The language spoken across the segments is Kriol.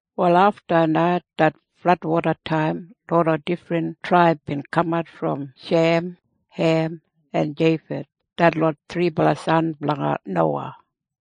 Wal afta det fladwodataim loda difrin traib bin kamat brom Shem, Hem en Jeifeth detlot thribala san blanga Nowa.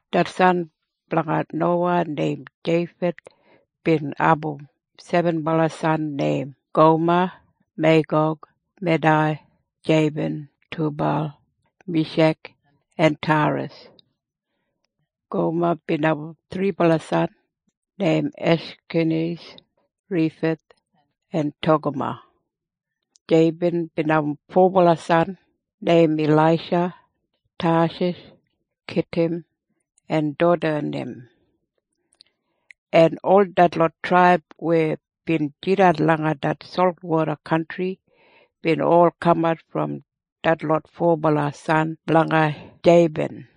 Det san blanga Nowa neim Jeifeth bin abum sebenbala san neim Goma, Meigog, Medai, Jeiban, Tubal, Mishek en Tairas. Goma bin abum thribala san neim Eshkenes, Rifeth en Togama. Jeiban bin abum fobala san neim Ilaisha, Tashish, Kitim en Dodanim. En ol detlot traib weya bin jidan langa det solwoda kantri bin ol kamat brom detlot fobala san blanga Jeiban.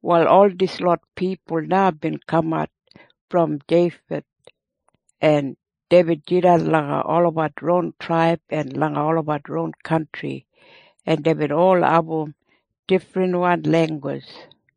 Wal ol dislot pipul na bin kamat brom Jeifeth, en deibin jidan langa olabat ron traib en langa olabat ron kantri, en deibin ol abum difrinwan langgus.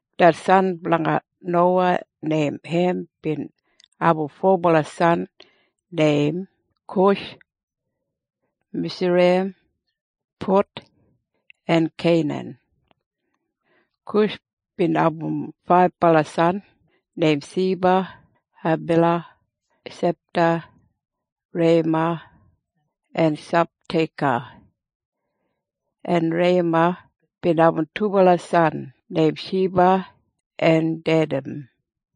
Det san blanga Nowa neim Hem bin abum fobala san neim Kush, Misraim, Put en Keinan. Kush bin abum faibala san neim Seba, Habila, Sabta, Reiyama en Sabteka. En Reiyama bin abum dubala san neim Shiba en Dedan.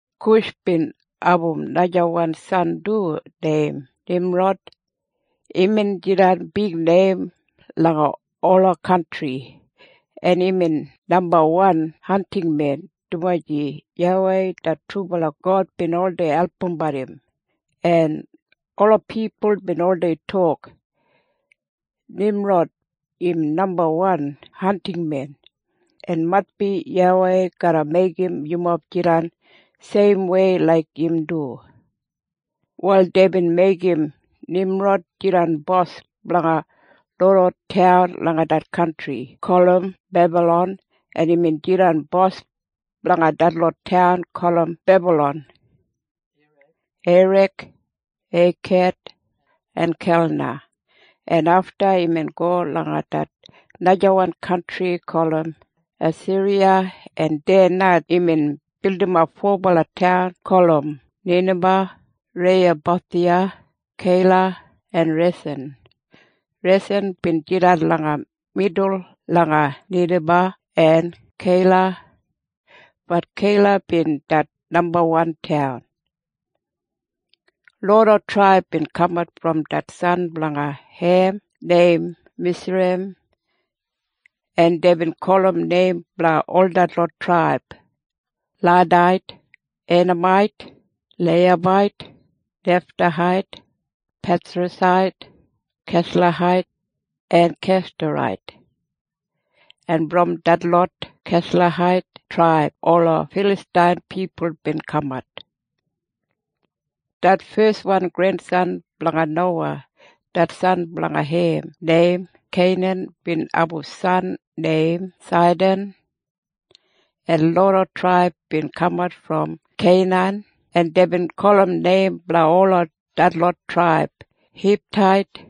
Kush bin abum najawan san du neim Nimrod. Imbin jidan bigneim langa ola kantri, en imbin nambawan hantingmen, dumaji YAWEI det trubala God bin oldei albumbat im. En ola pipul bin oldei tok, “Nimrod im nambawan hantingmen. En maitbi YAWEI garra meigim yumob jidan seimwei laik im du.” Wal deibin meigim Nimrod jidan bos blanga loda taun langa det kantri gulum Bebalon, en imbin jidan bos blanga detlot taun gulum Bebalon, Irek, Ekad en Kalna, en afta imbin go langa det najawan kantri gulum Asiriya, en deya na imbin bildimap fobala taun gulum Ninaba, Reiyabothiya, Keila en Resen. Resen bin jidan langa midul langa Ninaba en Keila. Bat Keila bin det nambawan taun. Loda traib bin kamat brom det san blanga Hem neim Misraim en deibin gulum neim blanga ol detlot traib Ladait, Einamait, Leiyabait, Neftahait, Pethrasait, Keslahait en Keftorait. En brom detlot Keslahait traib ola Filastain pipul bin kamat. Det feswan grensan blanga Nowa det san blanga Hem neim Keinan bin abum san neim Saidan, en loda traib bin kamat brom Keinan, en deibin gulum neim blanga ol detlot traib Hitait,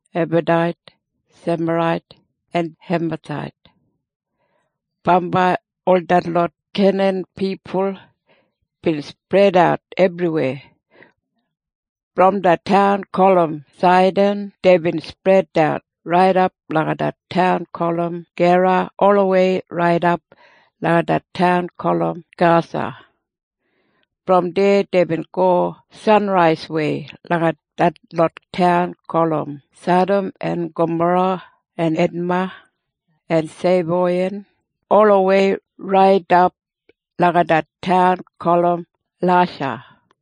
Abadait, Semarait en Hemathait. Bambai ol detlot Keinan pipul bin spredat ebriweya. Brom det taun gulum Saidan deibin spredat raidap langa det taun gulum Gera olawei raidap langa det taun gulum Gasa. Brom deya deibin go sanraiswei langa detlot taun gulum Sadam en Gamora en Edma en Seboiyim olawei raidap langa det taun gulum Lasha.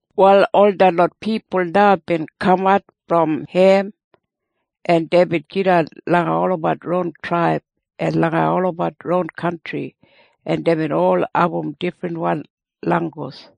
Wal ol detlot pipul na bin kamat brom Hem, en deibin jidan langa olabat ron traib en langa olabat ron kantri, en deibin ol abum difrinwan langgus.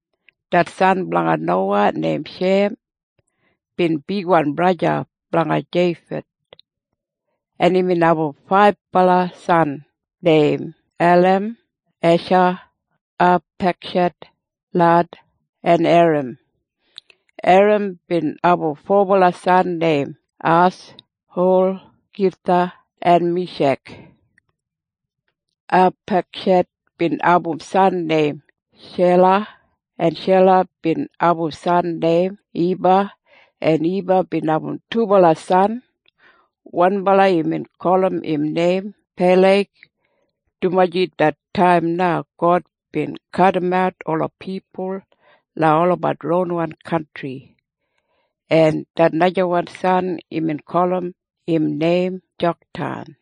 Det san blanga Nowa neim Shem bin bigwan braja blanga Jeifeth, en imbin abum faibala san neim Elam, Esha, Apekshed, Lad en Eram. Eram bin abum fobala san neim As, Hul, Githa en Mishek. Apekshed bin abum san neim Shela, en Shela bin abum san neim Iba, en Iba bin abum dubala san. Wanbala imbin gulum im neim Peleg, dumaji det taim na God bin kadimat ola pipul langa olabat ronwan kantri. En det najawan san imbin gulum im neim Joktan.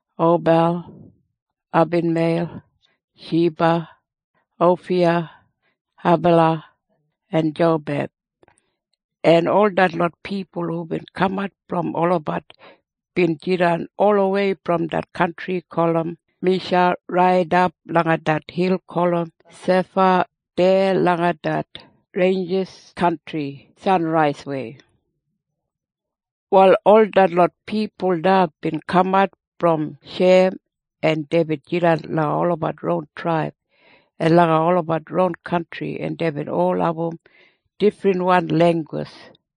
Obal, Abimeil, Shiba, Ofiya, Habila en Jobab. En ol detlot pipul hubin kamat brom olabat bin jidan olawei brom det kantri gulum Misha raidap langa det hil gulum Sefa deya langa det reinjis kantri sanraiswei. Wal ol detlot pipul na bin kamat brom Shem, en deibin jidan langa olabat ron traib en langa olabat ron kantri, en deibin ol abum difrinwan langgus.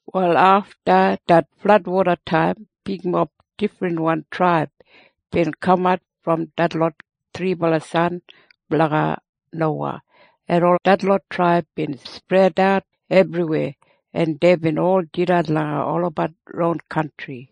Wal afta det fladwodataim bigmob difrinwan traib bin kamat brom detlot thribala san blanga Nowa, en ol detlot traib bin spredat ebriweya, en deibin ol jidan langa olabat ron kantri.